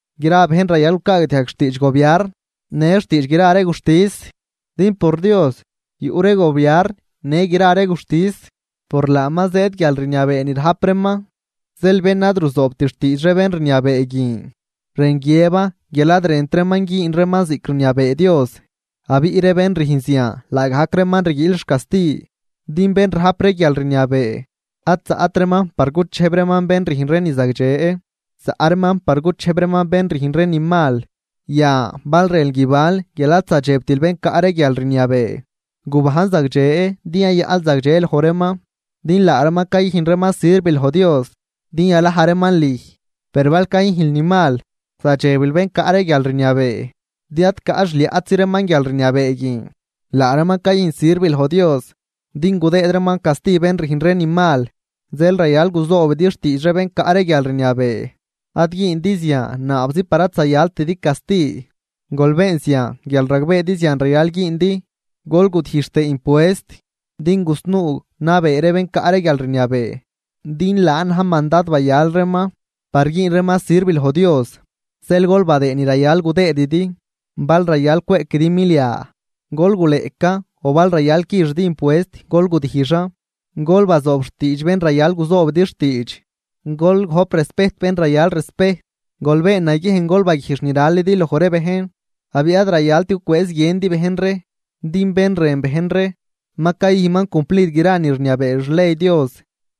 Gra bejn rayal gucaagdiajg xtiidx gobiarn në xtiidx gra ree guxtis. Din por Dios yuꞌ ree gobiarn në gra ree guxtis, por laaman zëëd guialrniabee ni rajp reeman. Zeel bén ad ruzoobt xtiidx ree bén rniabee guin, rën guiëban guial ad rënt reeman güün reeman ziꞌc rniabee Dios. Abiꞌ ree bén rüjn zian laagajc reeman rguiil xcasti, din bén rajp ree guialrniabee ad zaꞌt reeman par guchejb reeman bén rüjn ree ni zagdxe, zaꞌ reeman par guchejb reeman bén rüjn ree ni mal. Yan bal rënl guibanl guial ad zadxebtil bén caꞌ ree guialrniabee, gubajn zagdxe din yayaꞌnl zagdxe loj reeman. Din laa reeman cayüjn reeman sirv loj Dios din yalaj reeman lüj. Per bal cayüjnl ni mal, zadxebil bén caꞌ ree guialrniabee, din ad caꞌ xliaꞌtzi reeman guialrniabee guin, laa reeman cayüjn sirv loj Dios din gudëëd reeman casti bén rüjn ree ni mal. Zeel rayal guzoobidi xtiidx ree bén caꞌ ree guialrniabee, ad güündi zian naabzi par ad zayaltidi casti, gol been zian guial ragbeedi zian rayal güündi. Gol gudijx tëë impuest, din gusnuu nabee ree bén caꞌ ree guialrniabee, din laan na̱j mandad bayal reeman par güün reeman sirv loj Dios. Zeel gol badëëd ni rayal gudëëdidi, bal rayal cweꞌquidi milia, gol guleꞌcan o bal rayal quixidi impuest, gol gudijxan. Gol bazoob xtiidx bén rayal guzoobidi xtiidx, gol gojp respejt bén rayal respejt. Gol been naguiejn gol baguijx ni ralidi loj ree bejn, abiꞌ ad rayalt gucwëëz guiëndi bejn ree. Din bén rën bejn ree, ma cayüjnman cumplid gra ni rniabee xley Dios.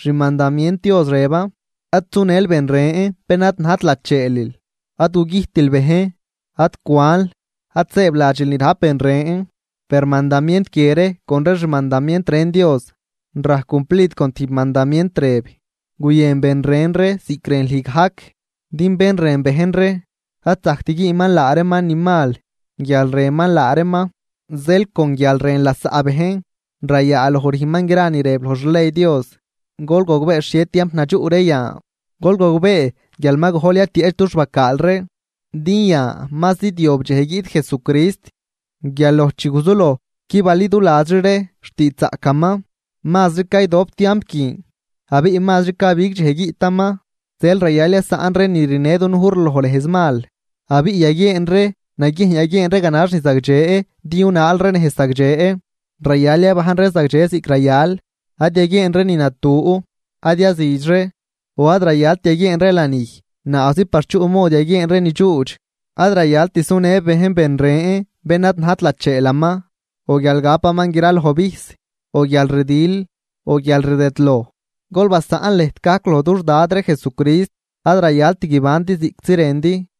Xmandamient Dios rëban: “Ad sunël bén ren bén ad najt lacheelil, ad gugüjtil bejn, ad cwanl, ad sëëbladxil ni rajp ben ren”, per mandamient guie ree, con ree xmandamient ren Dios rajc cumplid con tijb mandamient rëb: “Guyën ben ren ree ziꞌc rën lüj gajc.” Din bén rën bejn ree ad zajct güünman laa reeman ni mal guial rënman laa reeman. Zeel con guial rën lasaꞌ bejn rayaaloj rüjnman gra ni rëb loj xley Dios. Gol gogbee xhie tiamp nadxuꞌ ree yan, gol gogbee guial ma gojl yatieꞌch dux bacaal ree. Din yan ma zidyob dxej guiꞌt Jesucrist guial loj chi guzuloj qui baliduladxri ree xtiidxzaꞌcaman. Mazri caydop tiamp guin, abiꞌ mazri cabig dxej guiꞌtaman, zeel rayal yasaꞌn ree ni rinë dunuj ree loj nejz mal, abiꞌ yaguieen ree naguiejn yaguieen ree ganax ni zagdxe din yunaal ree nejz zagdxe. Rayal yabajn ree zagdxe ziꞌc rayal, ad yaguieen ree ni natu. Ad yazüdx ree, o ad rayalt yaguieen ree lanij naabzi par chuꞌ mod yaguieen ree ni dxuudx. Ad rayalt sunë bejn ben ren bén ad najt lacheelaman, o guial gapaman graloj vijs, o guialrdil o guialrdëdloj. Gol basaꞌn lëjt gajc loj dux Dad ree Jesucrist, ad rayalt guibandi ziꞌctzi rëndi.